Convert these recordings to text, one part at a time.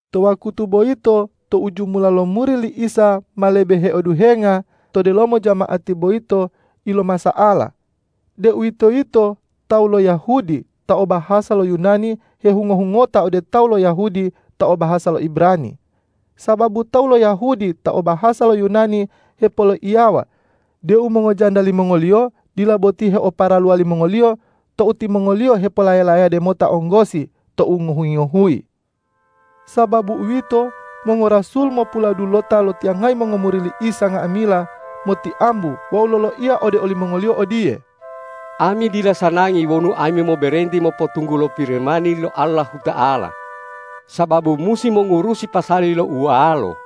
To wakutu boyito tou jumula lo muri li Isa ma lebe heoduhenga, to delomo jama'ati boyito ilomasa'ala, deuwitoyito tawu lo Yahudi ta o bahasa lo Yunani hehungo-hungota ode tawu lo Yahudi ta o bahasa lo Ibrani, sababu tawu lo Yahudi ta o bahasa lo Yunani hepoloiyawa deu mongojanda limongoliyo dila boti heoparaluwa limongoliyo tou timongoliyo hepolaya-layade mota onggosi tou ngohuyi-ngohuyi. Sababu uwito, mongorasul mopuladulota lotiyangayi mongomuri li Isa nga'amila motiambu wawu loloiya ode olimongoliyo odiye,”Ami dila sanangi wonu ami moberenti mopotunggulo Pirimani lo Allahuta'ala sababu musi mongurusi pasali lo ualo.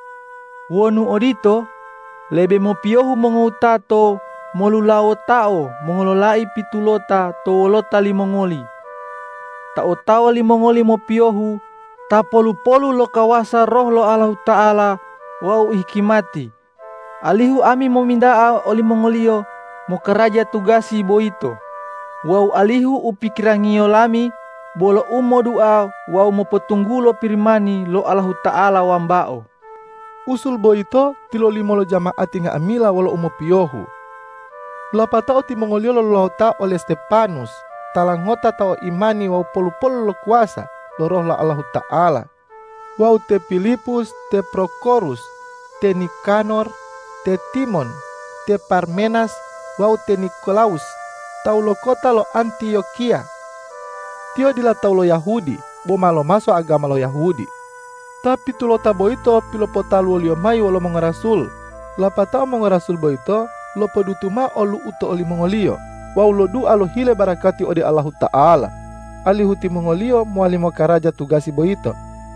Wonu odito, lebe mopiyohu mongowutato molulawotao mongololai pitulota to wolota limongoli, ta otawa limongoli mopiyohu, ta polu-polu lo kawasa Roh Allahuta'ala wawu hikimati, alihu ami mominta'a olimongoliyo mokaraja tugasi boyito wawu alihu u pikirangiyo lami bolo u modua wawu mopotunggulo Pirimani lo Allahuta'ala wambao.” Usul boyito tilolimo lo jama'ati nga'amila wolo umopiyohu. Lapatao timongoliyo lolulawota ole Stepanus tala ngota ta o imani wawu polu-polu lo kawasa lo Roh lo Allahuta'ala, wawu te Pilipus, te Prokorus, te Nikanor, te Timon, te Parmenas wawu te Nikolawus tawu lo kota lo Antiyokiya. Tiyo dila tawu lo Yahudi boma lomaso agama lo Yahudi. Ta pitulota boyito pilopotaluwoliyo mayi wolo mongorasul, lapatao mongorasul boyito lopodutu mao lo olu'u to olimongoliyo wawu lodua lohile barakati ode Allahuta'ala, alihu timongoliyo mowali mokaraja tugasi boyito.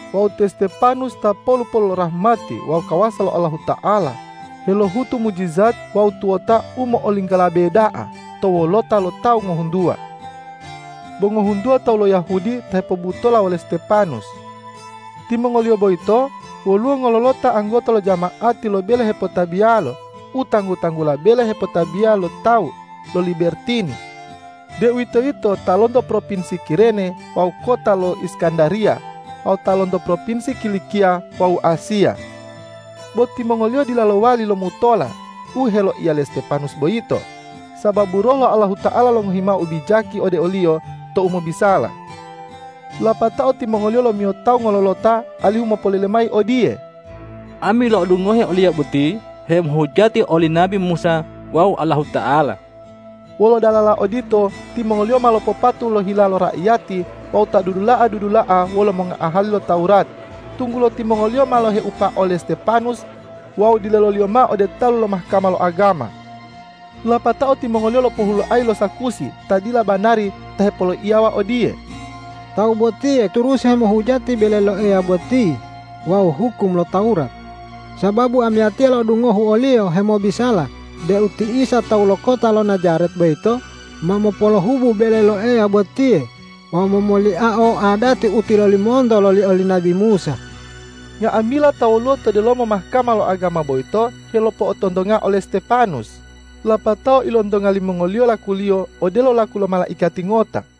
Wawu te Stepanus ta polu-polu lo rahmati wawu kawasa lo Allahuta'ala, helohutu mujijat wawu tuwota u mo'olinggolabe da'a to wolota lo tawu ngohuntuwa. Bo ngohuntuwa tawu lo Yahudi ta hepobutola wole Stepanus. Timongoliyo boyito woluwo ngololota anggota lo jama'ati lo bele hepotabiyalo u tanggu-tanggula Bele Hepotabiya lo Tawu lo Libertini, deuwitoyito ta lonto propinsi Kirene wawu kota lo Iskandariya wawu ta lonto propinsi Kilikiya wawu Asiya. Bo timongoliyo dila lowali lomutola u heloiya le Stepanus boyito, sababu Roh lo Allahuta'ala longohi mao ubijaki ode oliyo tou mobisala. Lapatao timongoliyo lomiyo tawu ngololota alihu mopolele mayi odiye,”Ami lo'odungohe oliyo boti hemohujati oli nabi Musa wawu Allahuta'ala.” Wolo dalala odito timongoliyo ma lopopatu lo hila raiyati wawu ta dudula'a-dudula'a wolo mongoahali lo Tawurat, tunggulo timongoliyo ma loheupa ole Stepanus wawu dileloliyo mao ode talu lo Mahkama lo agama. Lapatao timongoliyo lopohuloayi lo sakusi ta dila banari ta hepoloiyawa odiye,”Tawu botiye turusi hemohujati bele lo Eya boti wawu hukum lo Tawurat, sababu amiyatiya lo'odungohu oliyo hemobisala deu ti Isa tawu lo kota lo Najaret boyito ma mopolohubu bele lo Eya botiye wawu momoliao adati u tilolimonto loli oli nabi Musa.” Nga'amila ta woluwo to delomo Mahkama lo agama boyito helopo'otontonga ole Stepanus, lapatao ilontonga limongoliyo lakuliyo odelo laku lo malaikati ngota.